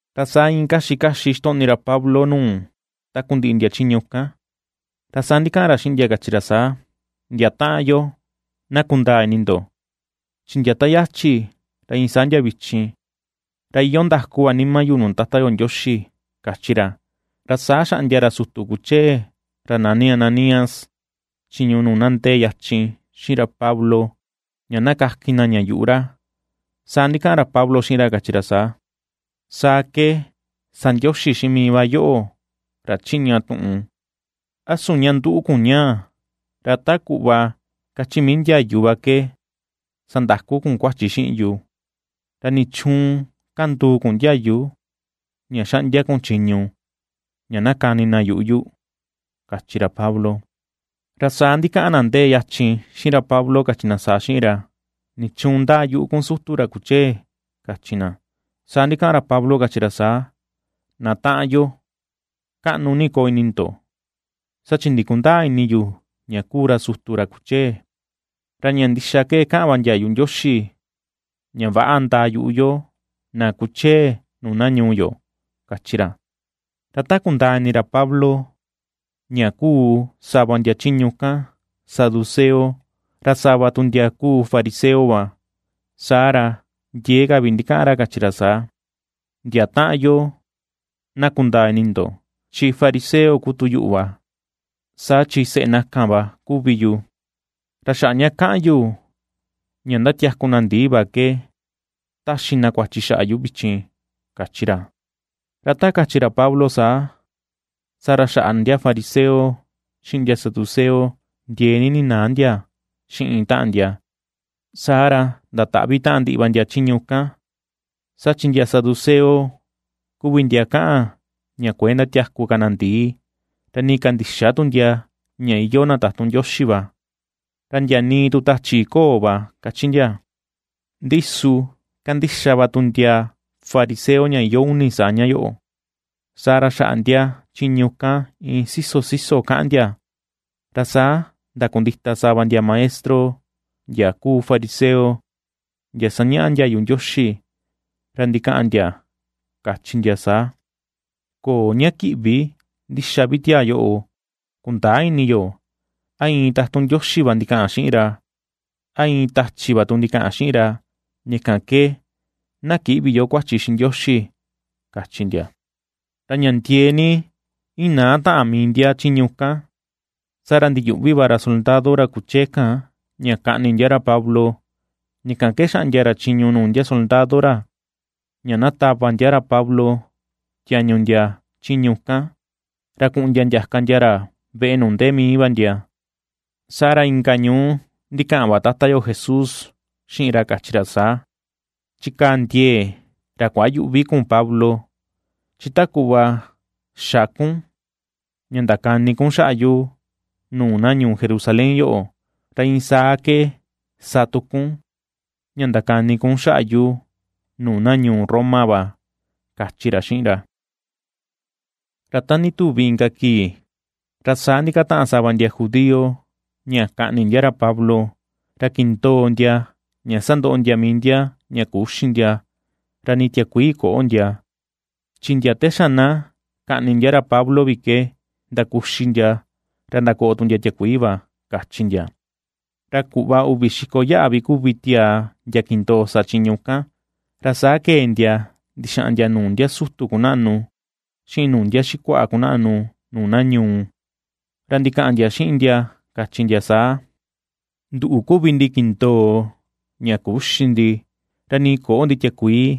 Ra saa iin kaxi kaxi ixtoꞌni ra Pablo nuu takundiꞌi ndia chiñu kan, ra saa ndikaꞌan ra xiꞌin ndia kachi ra saa: ―Ndia taꞌan yo, na kundaa ini ndo, chi ndia ta yachi ra iin saa ndia vichin ra iyoo ndaku va nima yu nuu Tata yo Ndioxi ―kachi ra. Ra saa xaꞌndia ra sutu kuchee ra nani Ananías, chiñu nuu na ndee yachin xiꞌin ra Pablo ña na kakin na ña yuꞌu ra. Saa ndikaꞌan ra Pablo xiꞌin ra, kachi ra saa: ―¡Saa ke sa Ndioxi xiꞌin mii va yoꞌo, ra chiꞌña tuꞌun! ¿A su ña nduꞌu kun ñaa, ra ta kuꞌva kachi mii ndiayu va ke sandaku kun kuachi xiꞌin yu? ¿Ra nichuun kanduu kun ndiayu, ra xaꞌndia kun chiñu ña na kani na yuꞌu yu? ―kachi ra Pablo. Ra saa ndikaꞌan na ndee yachin xiꞌin ra Pablo, kachi na saa xiꞌin ra: ―¿Nichuun ndaa yuꞌu kun sutu ra kuchee? ―kachi na. Saa ndikaꞌan ra Pablo kachi ra saa: ―Na taꞌan yo, kaꞌnu ni koo ini ndo, saa chi ndikundäa ini yu ña kuu ra sutu ra kuchee. Ra ña ndixa ke kaꞌan va ndiayu Ndioxi, ña, “Väꞌa ndaa yuꞌu yo na kuchee nuu na ñuu yo” ―kachi ra. Ra ta kundaa ini ra Pablo ña kuu sava ndia chiñu kan saduceo, ra sava tu ndia kuu fariseo va, saa ra ndiee ka vi ndikaꞌan ra kachi ra saa: ―Ndia taꞌan yo, na kundaa ini ndo chi fariseo kuu tu yuꞌu va, saa chi seꞌe na kan va kuvi yu. Ra xaꞌa ña kaꞌan yu ña ndatiaku na ndii va ke taxi na kuachi xaꞌa yu vichin ―kachi ra. Ra ta kachi ra Pablo saa, saa ra xaꞌa ndia fariseo xiꞌin ndia saduceo ndiee ni ninaa ndia xiꞌin taꞌan ndia, saa ra ndataꞌvi taꞌan ndiꞌi va ndia chiñu kan. Saa chi ndia saduceo kuvi ndia kaꞌan ña kuëe ndatiaku ka na ndii, ra nii kandïxa tu ndia ña iyoo na tatun Ndioxi va, ra ndia nii tu tachi köo va, kachi ndia. Ndi su kandixa va tu ndia fariseo ña iyoo uni saa ña yoꞌo. Saa ra xaꞌa ndia chiñu kan iin siso siso kaꞌan ndia, ra saa ndakundita sava ndia maestro ndia kuu fariseo, ndia sañaꞌa ndiayu Ndioxi, ra ndikaꞌan ndia, kachi ndia saa: ―Köo ña kiꞌvi ndixa vi tiaa yoꞌo, kundäa ini yo a iin tatun Ndioxi va ndikaꞌan xiꞌin ra, ra a iin tachi va tu ndikaꞌan xiꞌin ra. Ña kan ke na kïꞌvi yo kuachi xiꞌin Ndioxi ―kachi ndia. Ra ña ndiee ni inaa taꞌan mii ndia chiñu kan, saa ra ndiyuꞌvi va ra soldado ra kuchee kan ña kaꞌni ndia ra Pablo, ña kan ke xaꞌndia ra chiñu nuu ndia soldado ra, ña na tava ndia ra Pablo tiañu ndia chiñu kan ra kuꞌun ndia ndiaka ndia ra veꞌe nuu ndee mii va ndia. Saa ra inka ñuú, ndikaꞌan va Tata yo Jesús xiꞌin ra, kachi ra saa: ―Chikaa ndiee ra kuayüꞌvi kun Pablo, chi ta kuꞌva xa kun ña ndakani kun xaꞌa yu nuu na ñuu Jerusalén yoꞌo, ra iin saa ke sa tu kun ña ndakani kun xaꞌa yu nuu na ñuu Roma va ―kachi ra xiꞌin ra. Ra ta ndituvi inka kii, ra saa ndikataꞌan sava ndia judío ña kaꞌni ndia ra Pablo, ra kindoo ndia ña sandoꞌo ndia mii ndia ña küxi ndia, ra nii tiakuii köꞌo ndia, chi ndia te xa na kaꞌni ndia ra Pablo vi ke ndakuxi ndia ra ndakoꞌo tu ndia tiakuii va, kachi ndia. Ra kuꞌva uvi xiko yaꞌa vi kuvi tiaa ndia kindoo sa chiñu kan. Ra saa kee ndia ndixaꞌan ndia nuu ndia sutu kunaꞌnu, xiꞌin nuu ndia xikuaꞌa kunaꞌnu nuu na ñuu, ra ndikaꞌan ndia xiꞌin ndia kachi ndia saa: ―Nduꞌu kuvi ndi kindoo, ña küxi ndi, ra nii köꞌo ndi tiakuii,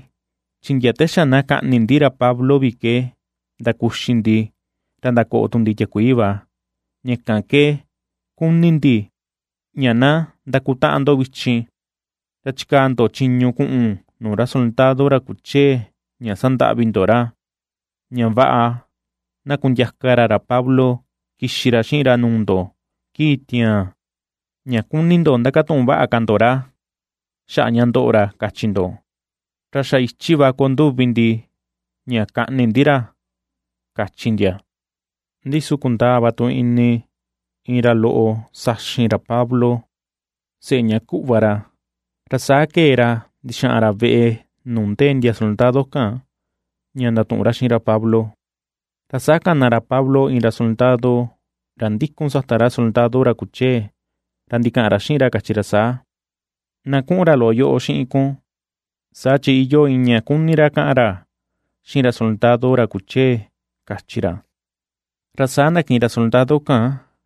chi ndia te xa na kaꞌni ndi ra Pablo vi ke ndakuxi ndi, ra ndakoꞌo tu ndi tiakuii va. Ña kan ke kuni ndi ña na ndakutaꞌan ndo vichin, ra chikaa ndo chiñu kuꞌun nuu ra soldado ra kuchee ña sandaꞌvi ndo ra, ña vaꞌa na kundiaka ra ra Pablo kixi ra xiꞌin ra nuu ndo kii tiaan, ña kuni ndo ndakatuꞌun vaꞌa ka ndo ra xaꞌa ña ^ndoꞌo ra kachi ndo. Ra xa ichi va koo nduvi ndi ña kaꞌni ndi ra ―kachi ndia. Ndi su kundaa va tu ini iin ra loꞌo saxin ra Pablo, seꞌe ña kuꞌva ra, ra saa kee ra ndixaꞌan ra veꞌe nuu ndee ndia soldado kan ña ndatuꞌun ra xiꞌin ra Pablo. Ra saa kana ra Pablo iin ra soldado ra ndikun sata ra soldado ra kuchee, ra ndikaꞌan ra xiꞌin ra kachi ra saa: ―Na kuꞌun ra loꞌo yoꞌo xiꞌin kun saa chi iyoo iin ña kuni ra kaꞌan ra xiꞌin ra soldado ra kuchee ―kachi ra. Ra saa ndakiꞌin ra soldado kan,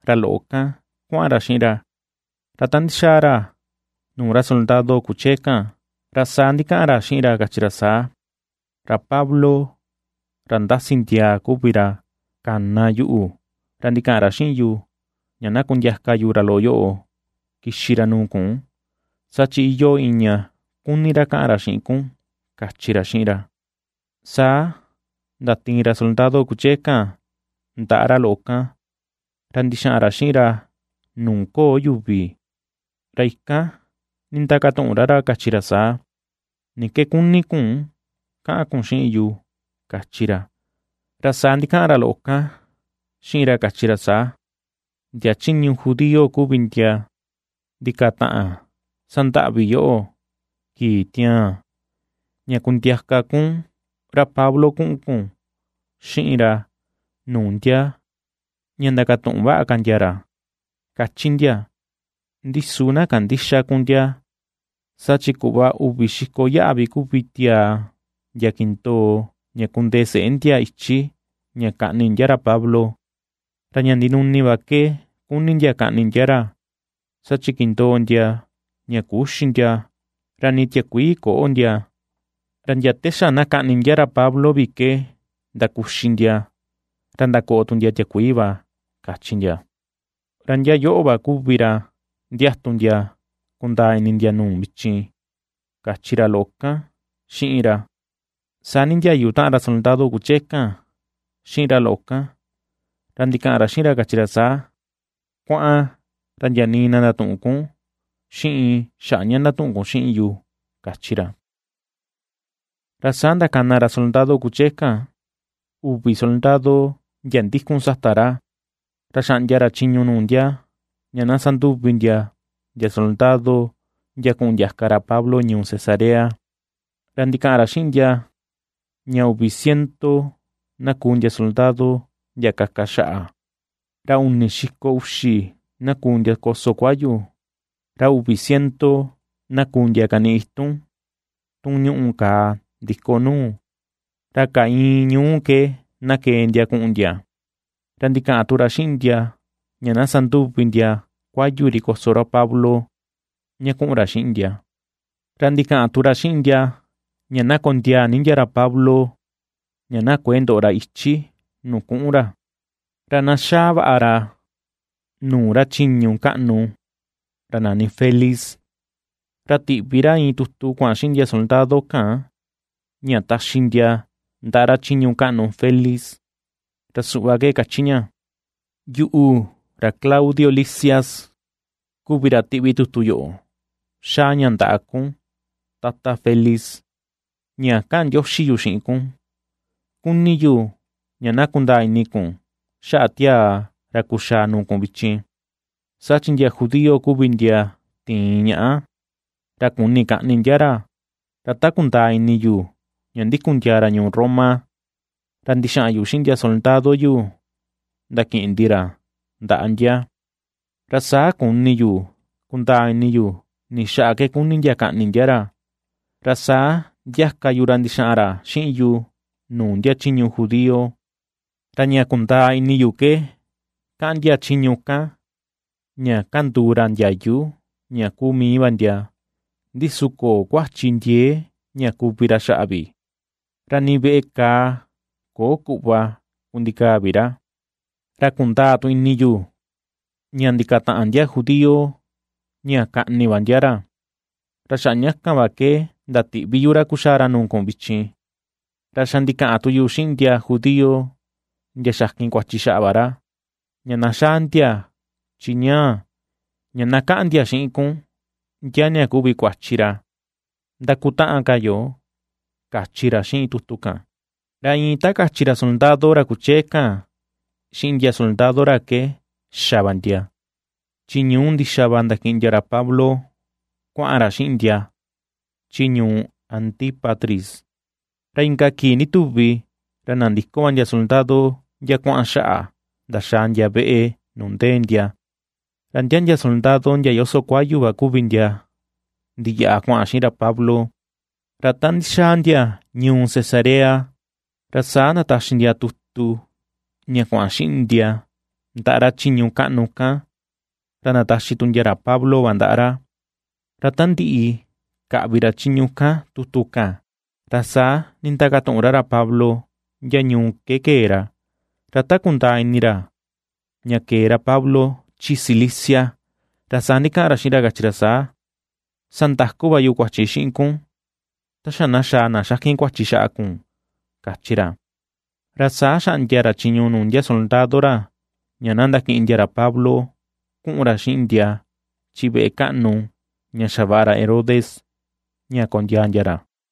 ra loꞌo kan kuaꞌan ra xiꞌin ra, ra ta ndixaa ra nuu ra soldado kuchee kan, ra saa ndikaꞌan ra xiꞌin ra kachi ra saa: ―Ra Pablo ra ndasi ndiaa kuvi ra kana yuꞌu, ra ndikaꞌan ra xiꞌin yu, ña na kundiaka yu ra loꞌo yoꞌo kixi ra nuu kun, saa chi iyoo iin ña kuni ra kaꞌan ra xiꞌin kun ―kachi ra xiꞌin ra. Saa ndatiin ra soldado kuchee kan ndaꞌa ra loꞌo kan, ra ndixaꞌan ra xiꞌin ra nuu köo yuvi, ra ikan nindakatuꞌun ra ra, kachi ra saa: ―¿Ni ke kuni kun kaꞌan kun xiꞌin yu? ―kachi ra. Ra saa ndikaꞌan ra loꞌo kan xiꞌin ra kachi ra saa: ―Ndia chiñu judío kuvi ndia ndikataꞌan sandaꞌvi yoꞌo, kii tiaan, ña kundiaka kun ra Pablo kuꞌun kun xiꞌin ra nuu ndia ña ndakatuꞌun vaꞌa ka ndia ra, ^kachi ndia. Ndi su na kandïxa kun ndia, saa chi kuꞌva uvi xiko yaꞌa vi kuvi tiaa ndia kindoo ña kundee seꞌe ndia ichi ña kaꞌni ndia ra Pablo. Ra ña ndinuni va ke kuni ndia kaꞌni ndia ra, saa chi kindoo ndia ña küxi ndia, ra nii tiakuii köo ndia, ra ndia te xa na kaꞌni ndia ra Pablo vi ke ndakuxi ndia, ra ndakoꞌo tu ndia tiakuii va, kachi ndia. Ra ndia yoꞌo va kuvi ra ndiatu ndia kundaa ini ndia nuu vichin ―kachi ra loꞌo kan xiꞌin ra. Saa nindiayu taꞌan ra soldado kuchee kan xiꞌin ra loꞌo kan, ra ndikaꞌan xiꞌin ra kachi ra saa: ―Kuaꞌan, ra ndia nii na ndatüꞌun kun xiꞌin xaꞌa ña ndatuꞌun kun xiꞌin yu ―kachi ra. Ra saa ndakana ra soldado kuchee kan, uvi soldado ndia ndikun sata ra, ra xaꞌndia ra chiñu nuu ndia ña na sanduvi ndia, ndia soldado ndia kuꞌun ndiaka ra Pablo ñuu Cesarea. Ra ndikaꞌan ra xiꞌin ndia, ña uvi ciento na kuu ndia soldado ndia kaka xaꞌa, ra uni xiko uxi na kuu ndia koso kuayu, ra uvi ciento na kuu ndia kaniꞌi itun tun ñuꞌu kàà ndiko nuu, Ra kaa ìi̱n ñuú ke na kee ndia kuꞌun ndia. Ra ndikaꞌan tu ra xiꞌin ndia, ña na sanduvi ndia kuayu ri koso ra Pablo, ña kuꞌun ra xiꞌin ndia, ra ndikaꞌan tu ra xiꞌin ndia ña na kondiaa ni ndia ra Pablo ña na kuëe ndoꞌo ra ichi nuu kuꞌun ra, ra na xaa vaꞌa ra nuu ra chiñu kaꞌnu ra nani Felix. Ra tiꞌvi ra iin tutu kuaꞌan xiꞌin ndia soldado kan ña taxi ndia ndaꞌa ra chiñu kaꞌnu Felix, ra suꞌva ke kachi ña: “Yuꞌu, ra Claudio Lisias, kuvi ra tiꞌvi tutu yoꞌo xaa ña ndaꞌa kun Tata Felix, ña kaꞌan ndioxi yu xiꞌin kun. Kuni yu ña na kundaa ini kun xaꞌa tiaa ra kuxaa nuu kun vichin, saa chi ndia judío kuvi ndia tiin ñaꞌa, ra kuni kaꞌni ndia ra, ra ta kundaa ini yu ña ndikun ndiaa ra ñuu Roma, ra ndixaꞌan yu xiꞌin ndia soldado yu ndakiꞌin ndi ra ndaꞌa ndia. Ra saa kuni yu kundaa ini yu ni xaꞌa ke kuni ndia kaꞌni ndia ra, ra saa ndiaka yu ra ndixaꞌan ra xiꞌin yu nuu ndia chiñu judío, Ra ña kundaa ini yu ke kaꞌan ndia chiñu kan, ña ^kanduu ra ndiayu ña kuu mii va ndia, ndi su köo kuachi ndiee ña kuvi ra xaꞌa vi, ra ni veꞌe kàà köo kuꞌva kundikaa vi ra. Ra kundaa tu ini yu, ña ndikataꞌan ndia judío ña kaꞌni va ndia ra, ra xaꞌa ña kan va ke ndatiꞌvi yu ra kuxaa ra nuu kun vichin. Ra xa ndikaꞌan tu yu xiꞌin ndia judío ndia xakin kuachi xaꞌa va ra, ña na xaa ndia chi ñaa, ña na kaꞌan ndia xiꞌin kun ndia ña kuvi kuachi ra. Ndakutaꞌan ka yo”, kachi ra xiꞌin tutu kan. Ra iin ta kachi ra soldado ra kuchee kan xiꞌin ndia soldado ra ke xa va ndia, chi ñuu ndixa va ndakiꞌin ndia ra Pablo kuaꞌan ra xiꞌin ndia chi ñuu Antípatris. Ra inka kii ndituvi ra nandiko va ndia soldado ndia kuaꞌan xaꞌa, ndaxaa ndia veꞌe nuu ndee ndia, ra ndia ndia soldado ndia yoso kuayu va kuvi ndia ndiyaꞌa kuaꞌan xiꞌin ra Pablo. Ra ta ndixaa ndia ñuu Cesarea ra saa ndataxi ndia tutu ña kuaꞌan xiꞌin ndia ndaꞌa ra chiñu kaꞌnu kan, ra ndataxi tu ndia ra Pablo va ndaꞌa ra. Ra ta ndiꞌi kaꞌvi ra chiñu kan tutu kan, ra saa nindakatuꞌun ra ra Pablo ndia ñuu ke kee ra, ra ta kundaa ini ra ña kee ra Pablo chi Cilicia, ra saa ndikaꞌan ra xiꞌin ra kachi ra saa: ―Sa ndaku va yu kuachi xiꞌin kun, ta xa na xaa na xakin kuachi xaꞌa kun ―kachi ra. Ra saa xaꞌndia ra chiñu nuu ndia soldado ra ña na ndakiꞌin ndia ra Pablo kuꞌun ra xiꞌin ndia chi veꞌe kaꞌnu ña xavaꞌa ra Herodes ña kondiaa ndia ra.